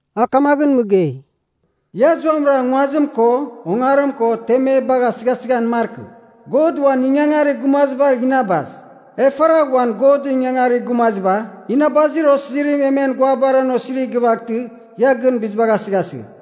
A kamaghɨn mɨgei, “Ia zuamɨra nguazim ko ongarim ko temebagh asɨghasɨghan markɨ. God uan ingangarir gumazibagh inabas. E faragh uan Godɨn ingangarir gumaziba, inabazir osizirim e men guabar an osirigh gɨvaghtɨ, ia gɨn bizibagh asɨghasɨgh.”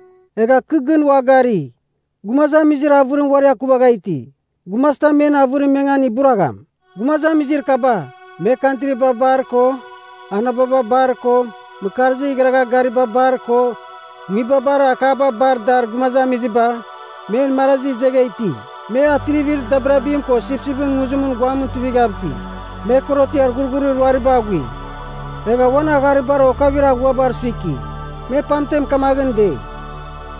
Egha kɨ gɨn ua gari, gumazamizir avɨrim uari akuvagha iti. Gumazitam men avɨrim mengan iburagham. Gumazamizir kaba, me kantriba bar ko anababa bar ko mɨkarzir igharagha gariba bar ko nguibabar akaba bar dar gumazamiziba, men marazira izegha iti. Me atrivir dabirabim ko Sipsipɨn Nguzimɨn guamɨn tuivighav iti. Me korotiar ghurghurir ruariba aghui, egha uan agharibar okavir aghuabar suiki. Me pamten kamaghɨn dei,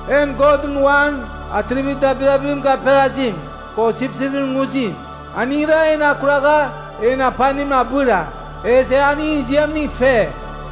“En Godɨn uan atrivir dabirabim gaperazim, ko Sipsipɨn Nguzim, aningra en akuragha en apanim abɨra. Ezɨ e aningɨn ziamning fe.”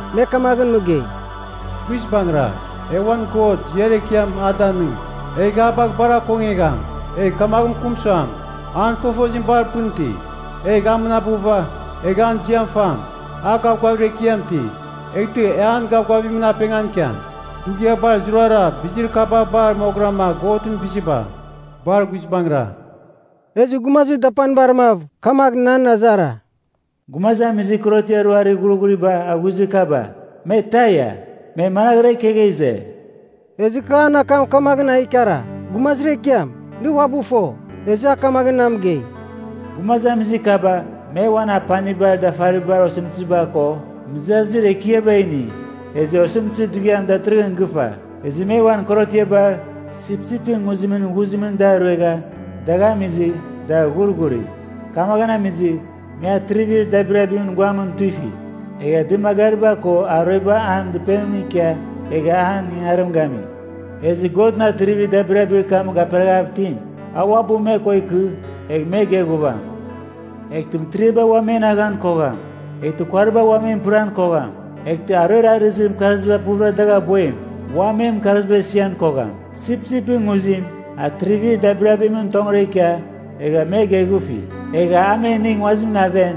Me kamaghɨn mɨgei, “Guizbangɨra! E uan God ziar ekiam a danɨng, egh a bagh bar akongegham, egh kamagh mɨkɨm suam, an fofozim bar pɨn iti. Egh a mɨnabɨva, egh an ziam fam. A gavgavir ekiam iti, eghtɨ e an gavgavimɨn apengan ikiam. Dughiabar zurara bizir kaba bar moghɨrama Godɨn biziba. Bar guizbangɨra!” Ezɨ gumazir dapanibar mav kamagh nan azara, “Gumazamizir korotiar ruarir ghurghuriba aghuizir kaba, me taia? Me managhɨra ikegha ize?” Ezɨ kɨ an akam kamagh a ikara, “Gumazir ekiam, nɨ uabɨ fo.” Ezɨ a kamagh na mɨgei, “Gumazamizir kaba me uan apanibar dafaribar osɨmtɨziba ko mɨzazir ekiaba ini. Ezɨ osɨmtɨzir dughiam datɨrɨghɨn gɨfa. Ezɨ me uan korotiaba Sipsipɨn Nguzimɨn ghuzimɨn da ruegha, dagh amizɨ, da ghurghuri. Kamaghɨn amizɨ me atrivir dabirabimɨn guamɨn tuifi. Egha dɨmagariba ko aruebar an dɨpenimɨn ikia egha an ingangarim gami. Ezɨ Godɨn atrivir dabirabir kam gaperaghav itim, a uabɨ me ko ikɨ egh me geghuvam. Eghtɨ mɨtiriaba ua men aghan kogham, eghtɨ kuariba ua men pɨran kogham. Eghtɨ aruer arɨzir mɨkarziba puvɨra dagh aboim, ua men mɨkarzibar isian kogham. Sipsipɨn Nguzim atrivir dabirabimɨn tongɨra ikia, egha me geghufi. Egha a me inigh nguazimɨn aven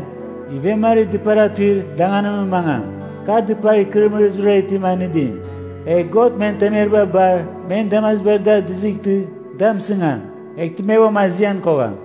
ivemarir dɨpar atuir danganimɨn mangam, kar dɨpar ikɨrɨmɨrir zurara itim anɨdim. Egh God men temeriba bar men damazibar da dizightɨ da mɨsigam, eghtɨ me uam azian kogham.”